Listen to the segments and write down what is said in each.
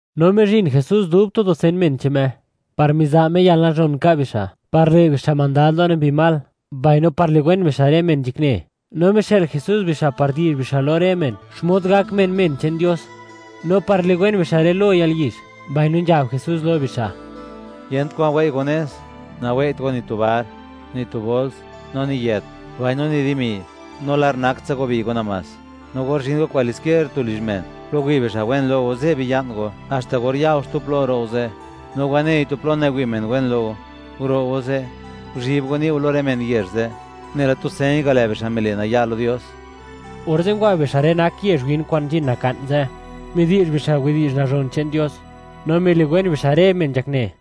No mizhin Jesús dub tu dusen men che'n Me, par miza' Me yalnazhon nka' bixa', par le' bixa' mandad lo rë mbi mal, mbaino par liwen bixa' rë men nzhakne; no mixë'l Jesús bixa' par di'zh bixa' lo rë men, xmod gak men, men che'n Dios, no par liwen bixa' rë lo yalyizh, mbaino nzhab Jesús lo bixa': ―Yent kwa'n wei' go nez; nawei't go ni tu bar, ni tu bols, no ni yët, mbaino ni dimi, no lar nak tsa go bi'y go namás. No or zhin go kwalisquier tu lizh men, plo wi' bixa' wen lo go, ze' biya'n go haxta or ya go xtu plo, ro' go ze'. No wanei tu plo nawi' men wen lo go, guro' go ze', guzhi'b go ni' go lo rë men yezh ze', nela tu señ ga', lë' bixa' mile' naya' lo Dios. Orze' ngwa bixa' rë nak yezh win, kwa'n nzhin naka'n ze', midi'zh bixa' widi'zh nazhon che'n Dios, no miliwen bixa' rë men nzhakne.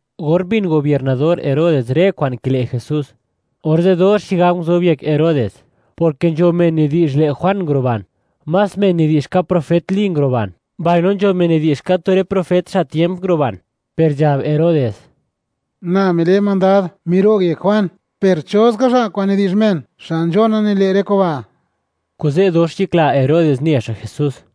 Or mbin gobiernador Herodes rë kwa'n kile' Jesús, orze' dox xigab nguzob yek Herodes, porke nzho men nidi'zh, lë' Juan nguruban, más men nidi'zh ka profet Li nguruban, mbaino nzho men nidi'zh, ka tu rë profet xa' tiemp nguruban, per nzhab Herodes: ―Na mile' mandad, miro'g yek Juan, ¿per cho ska xa' kwa'n nidi'zh men, xa' nzhona nile' rë kuba'? Kuze' dox nzhakla Herodes ne xa' Jesús.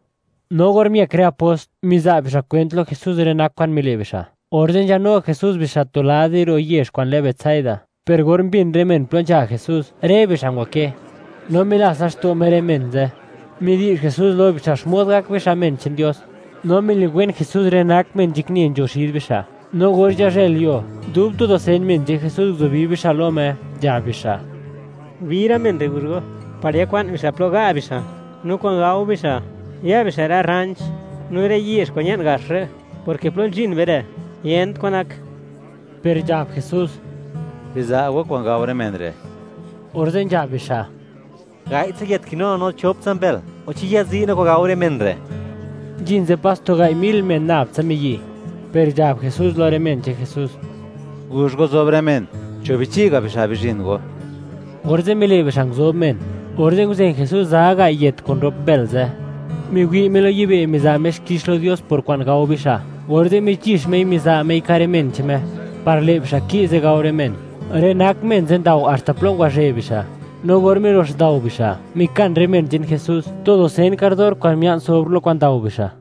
No or miëk rë apost, miza' bixa' kwent lo Jesús rë nak kwa'n mile' bixa', orze' nzhanu Jesús bixa' tu lad di ro' yezh kwa'n lë Betsaida. Per or mbin rë men plo nzha Jesús, rë bixa' ngwakë. No milats laxto' Me rë men ze'. Midi'zh Jesús lo bixa', xmod gak bixa' men che'n Dios, no miliwen Jesús rë nak men nzhakne nzho xid bixa'. No or nzhazhëlyuo, dub tu dusen men che'n Jesús, nguzubi bixa' lo Me, nzhab bixa': ―Bi rë men re', guzh go, par yakwa'n bixa' plo ga' bixa', no kwa'n gao bixa', ya bixa' rë rranch no rë yezh kwa'n ña'n gax re', porke plo nzhin be re', yent kwan nak. Per nzhab Jesús: ―¡Biza' go kwa'n gao rë men re'! Orze' nzhab bixa': ―Gai'tsa yët kinu no, no choptsa mbël, o ¿chi yazi' no kwa'n gao rë men re'? Nzhin ze' pas tu gai' mil men nab tsa miyi'. Per nzhab Jesús lo rë men che'n Jesús: ―Guzh go zob rë men, cho' bichi'ga' bixa' bizhin go. Orze' mile' bixa' nguzob men. Orze' nguzen Jesús za gai' yët kun rop mbël ze', miwi' Me lo yibë' miza' Me xkix lo Dios por kwa'n gao bixa', orze' michi'x Mei, miza' Mei ka' rë men che'n Me, par lë' bixa' ki'ze gao rë men. Rë nak men ze' ndao, haxta plo ngwazhë bixa'; no or milox ndao bixa', mikan rë men che'n Jesús, tu dusen kardor kwa'n mia'n sobr lo kwa'n ndao bixa'.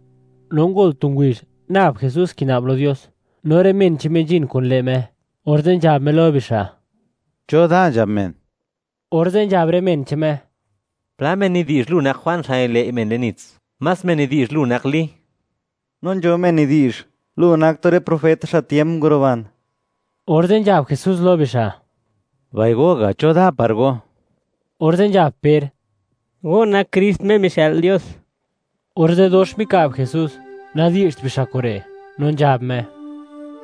No ngol tu ngubizh, nab Jesús kina'b lo Dios, no rë men che'n Me nzhin kun lë' Me, orze' nzhab Me lo bixa': ―¿Cho da nzhab men? Orze' nzhab rë men che'n Me: ―Pla men nidi'zh, lu nak Juan xa' nililëi' men le'n nits, más men nidi'zh, lu nak Li, no nzho men nidi'zh lu nak tu rë profet xa' tiemp nguruban. Orze' nzhab Jesús lo bixa': ―Mbai go ga', ¿cho da par go? Orze' nzhab Per: ―Go nak Krist Me mixë'l Dios. Orze' dox mika'b Jesús, nadi'zht bixa' kure', No nzhab Me: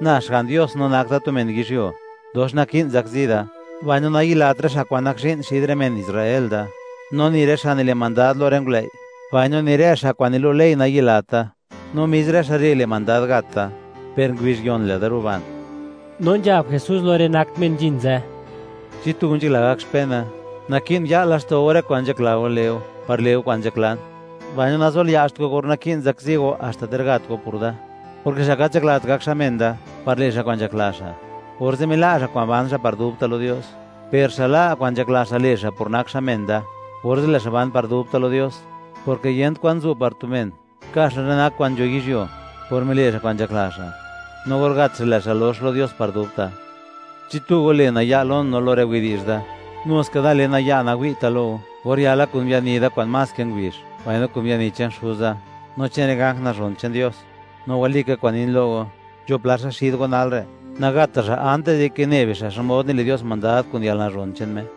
―Na Xga'n Dios no nak da tu men yizhyuo, dox naki'n zakzi da; mbaino nayilat rë xa' kwa'n nak zhi'n, xid rë men Israel da, no ni rë xa' nile' mandad lo rë ngulëi', mbaino ni rë xa' kwa'n nilu' ley, nayilat da; no mis rë xa' re' le' mandad gat da, per ngubizh yon lë'da ruban. No nzhab Jesús lo rë nak men nzhin ze': ―Chi tu go nzhakla gak xpena, naki'n ya'l laxto' go rë kwa'n nzhakla go le' go, par le' go kwa'n nzhaklan, mbaino nazolia'zht go (le't go naya') or naki'n zakzi go, haxta ter gat go por da, porke xa' gat nzhaklat gak xa' men da par le' xa' kwa'n nzhakla xa', orze' mila' xa' kwa'n ban xa' par dubta' lo Dios; per xa' la' kwa'n nzhakla xa' le' xa', por nak xa' men da, orze' lë' xa' ban par dubta' lo Dios, porke, yent kwan zu' par tu men, ka' xa' rë nak kwa'n nzho yizhyuo, por mile' xa' kwa'n nzhakla xa', no or gat xa', lë' xa' lox lo Dios par dubta'. Chi tu go le' naya' lon no lo rë widi'zh da, nu ska da le naya', nawi'ta' lo go, or yala kun biani da kwa'n más ke ngubizh, mbaino kun biani che'n Xuza, no che'n rë ganj nazhon che'n Dios. No walika kwa'n nin lo go, nzho pla xa' xid go nalre', nagata' xa' antis dike ne bixa', xmod nile' Dios mandad kun yalnazhon che'n Me.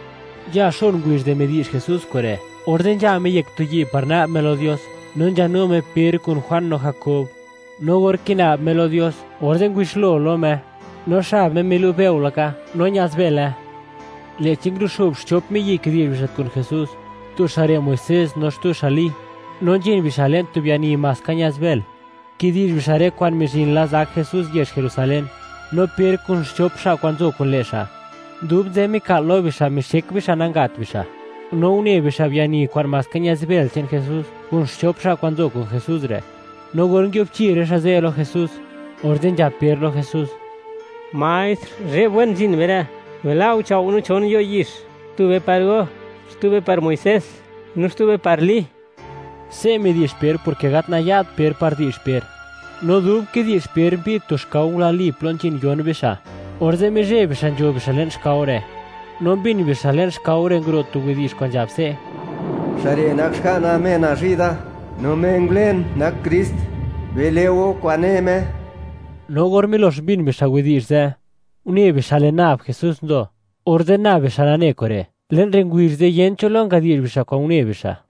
Nzha xon ngubizh di midi'zh Jesús kure', orze' nzha Me yek tu yi' par na'b Me lo Dios, no nzhanu Me Per kun Juan no Jakob. No or kina'b Me lo Dios, orze' ngubixlo lo Me; no xab Me milu' bëo laka, no ña'zbële. Lë'chi nguruxo'b xchop miyi', kidi'zh bixa' kun Jesús. Tu xa' re' Muisés, no xtu xa' Li. No nzhin bixa' le'n tu biani maska ña'zbël, kidi'zh bixa' rë kwa'n mizhin la zak Jesús yezh Jerusalén. No Per kun xchop xa' kwa'n nzo kun lë' xa', dub nzë mika'l lo bixa', mixek bixa' nanga't bixa', no une bixa' biani kwa'n maska ña'zbël che'n Jesús, kun xchop xa' kwa'n nzo kun Jesús re'; no or nguiubchi rë xa' ze' lo Jesús, orze' nzhab Per lo Jesús: ―Maestr, ¡zhe'b wen nzhin be re'! Bila' go chao' no chon yo' yix; tube par go, xtube par Muisés, no xtube par Li. Se' midi'zh Per porke gat naya't Per par di'zh Per. No dub kidi'zh Per, mbi'd tu xkao, ngulai plo nzhin yon bixa', orze' mizheb bixa' nzho bixa' le'n xkao re', no mbin bixa' le'n xkao re', nguro' tu widi'zh kwa'n nzhab se': ―¡Xa' re' nak Xga'na Me nazhi' da, no Me ngulen nak Krist; bile' go kwa'n ne Me! No or milox mbin bixa' widi'zh ze', une bixa' lë' nab Jesús nzo, orze' nab bixa' nane kure', le'n rë ngubizh ze', yent cho lo ngadi'zh bixa' kwa'n une bixa'.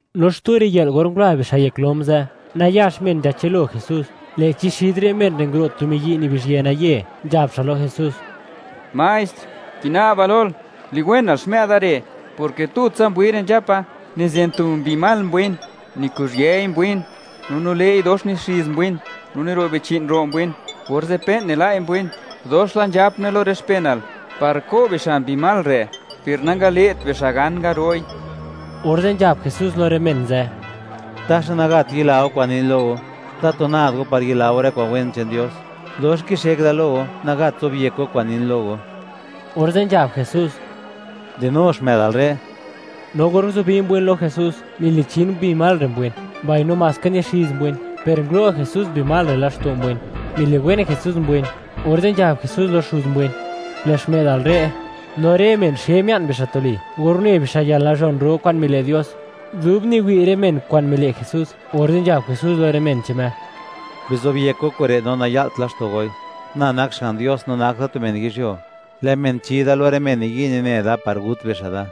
No xtu riyë'l, or ngula bixa' yek lom ze', nayax men nzhachëlo Jesús, lë'chi xid rë men re' nguro' tu miyi' nibizhyë naye, nzhab xa' lo Jesús: ―Maestr, kina'ba lol, liwenal xmë'da re', porke tutsa mbwin re' nzhapa. Nizen tu mbi mal mbwin, nikuzhiëi mbwin, no nile'i dox nixiz mbwin, no niro' bichi'n ro' mbwin, orze' pe'n nila'i mbwin. Dox la nzhapne lo rë xpenal par ko' bixa' mbi mal re', per nangale't bixa' gan ngaro'i. Orze' nzhab Jesús lo rë men ze': ―¡Taxa nagat yila go kwa'n nin lo go! ¡Tatu nad go par yila go rë kwa'n wen che'n Dios! ¡Dox kixek da lo go, nagat zobyek go kwa'n nin lo go! Orze' nzhab Jesús: ―¡Dinu xmë'dal re'! No or nguzubi mbwin lo Jesús, milichin mbi mal re' mbwin, mbaino maska nixiz mbwin; per ngulo' Jesús mbi mal re' laxto' mbwin, miliwen Jesús mbwin, orze' nzhab Jesús lo xuz mbwin: “Lë' xmë'dal re'”. No rë men xe mia'n bixa' tuli, or une bixa' yalnazhon ro kwa'n mile' Dios. Dub niwi' rë men kwa'n mile' Jesús, orze' nzhab Jesús lo rë men che'n Me: ―Bizobyek go kure', no naya'lt laxto' goi: Na nak Xga'n Dios, no nak da tu men yizhyuo, lë' men chi Da lo rë men niyi' nine da par gut bixa' Da.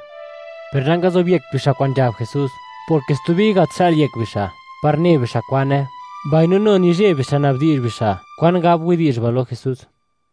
Per nangazobyekt bixa' kwa'n nzhab Jesús, porke stubi gat xa'l yek bixa', par ne bixa' kwane; mbaino nu nizheb bixa' nabdi'zh bixa', kwan gab widi'zh ba' lo Jesús.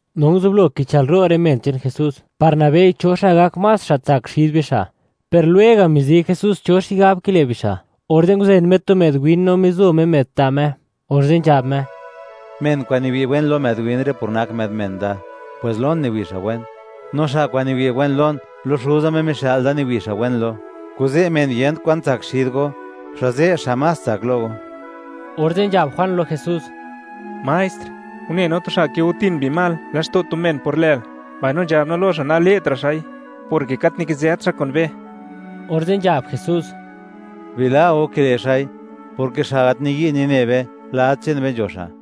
No nguzublo kichëlro' rë men che'n Jesús par nabei, ¿cho xa' gak más xa' tsak xid bixa'?, per lwega' mizi Jesús cho xigab kile' bixa', orze' nguzen Me tu më'd win, no mizo Me më'd ta' Me, orze' nzhab Me: ―Men kwa'n niwi' wen lo më'd win re' por nak më'd men da, pwes lon niwi' xa' wen; no xa' kwa'n niwi' wen lon, lo Xuza, Me mixë'l da, niwi' xa' wen lo. Kuze' men yent kwan tsak xid go, xa' ze' xa' más tsak lo go. Orze' nzhab Juan lo Jesús: ―Maestr, une no tu xa' kigotin mbi mal laxto' tu men por lël, no nzhab no lo xa' nale'tra' xa'i, porke gat nikizët xa' kun be. Orze' nzhab Jesús: ―Bila' go kile' xa'i, porke xa' gat niyi' nine be, lad che'n be nzho xa'.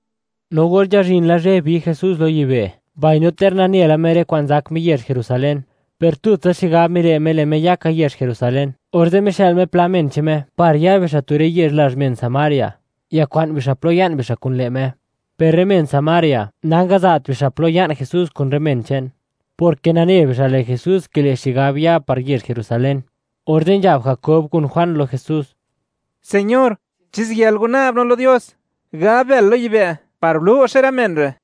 No or nzhazhin la zhë, bi Jesús lo yibë', mbaino ter nane la Me rë kwa'n zak Me yezh Jerusalén, per tutsa xigab mile' Me, lë' Me ya ka yezh Jerusalén, orze' mixë'l Me pla men che'n Me par ya bixa' tu rë yezh lazh men Samaria, yakwa'n bixa' plo ya'n bixa' kun lë' Me. Per rë men Samaria, nangaza't bixa' plo ya'n Jesús kun rë men che'n, porke nane bixa', lë' Jesús kile' xigab ya par yezh Jerusalén. Orze' nzhab Jakob kun Juan lo Jesús: ―Señor, ¿chi ziyël go na'b no lo Dios, gab bël lo yibë', par lo'xe rë men re'?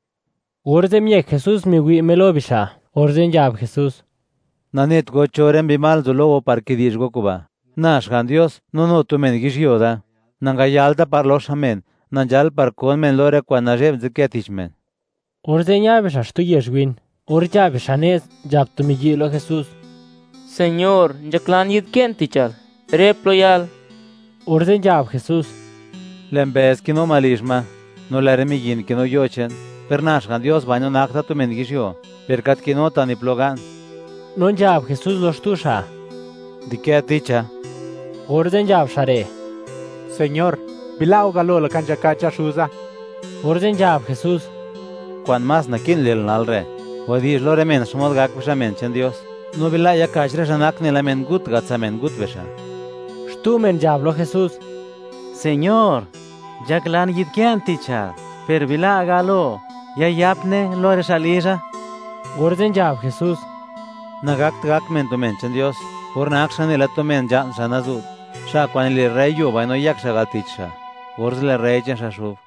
Orze' miëk Jesús, miwi' Me lo bixa', orze' nzhab Jesús: ―¡Nanet go cho rë mbi mal nzo lo go, par kidi'zh go kuba'! Na Xga'n Dios, no nu tu men yizhyuo da, nangayalta par loxa men; na nzhal, par kon men lo rë kwa'n nazhe'b, nzadkë tich men. Orze' ña bixa' xtu yezh win. Or nzha bixa' nez, nzhab tu miyi' lo Jesús: ―Señor, nzhaklan yi'dkë'n tichal, rë plo yal. Orze' nzhab Jesús: ―Lë' mbëz kinu ma lizh ma, no lë' rë miyin kinu yo che'n, per na Xga'n Dios, mbaino nak da tu men yizhyuo, per gat kinuta' ni plo ga'n. No nzhab Jesús lo xtu xa': ―Di'kë ticha. Orze' nzhab xa' re': ―Señor, bila' go galo laka nzhakacha xuza. Orze' nzhab Jesús: ―Kwa'n más naki'n le'l nal re', wadi'zh lo rë men, xmod gak bixa' men che'n Dios, no bila' yaka'ch rë xa' nak nela mengut ga', tsa' mengut bixa'. Xtu men nzhab lo Jesús: ―Señor, nzhaklan yi'dkë'n tichal, per bila' galo, yayapne lo rë xa' lizha. Orze' nzhab Jesús: ―Nagakt gak men tu men che'n Dios, or nak xa' nela tu men nzha'n, xa' nazu't. Xa' kwa'n nile' rrëi yuo mbaino yëk xa' al tich xa', orze' lë' rrëi che'n xa' xub.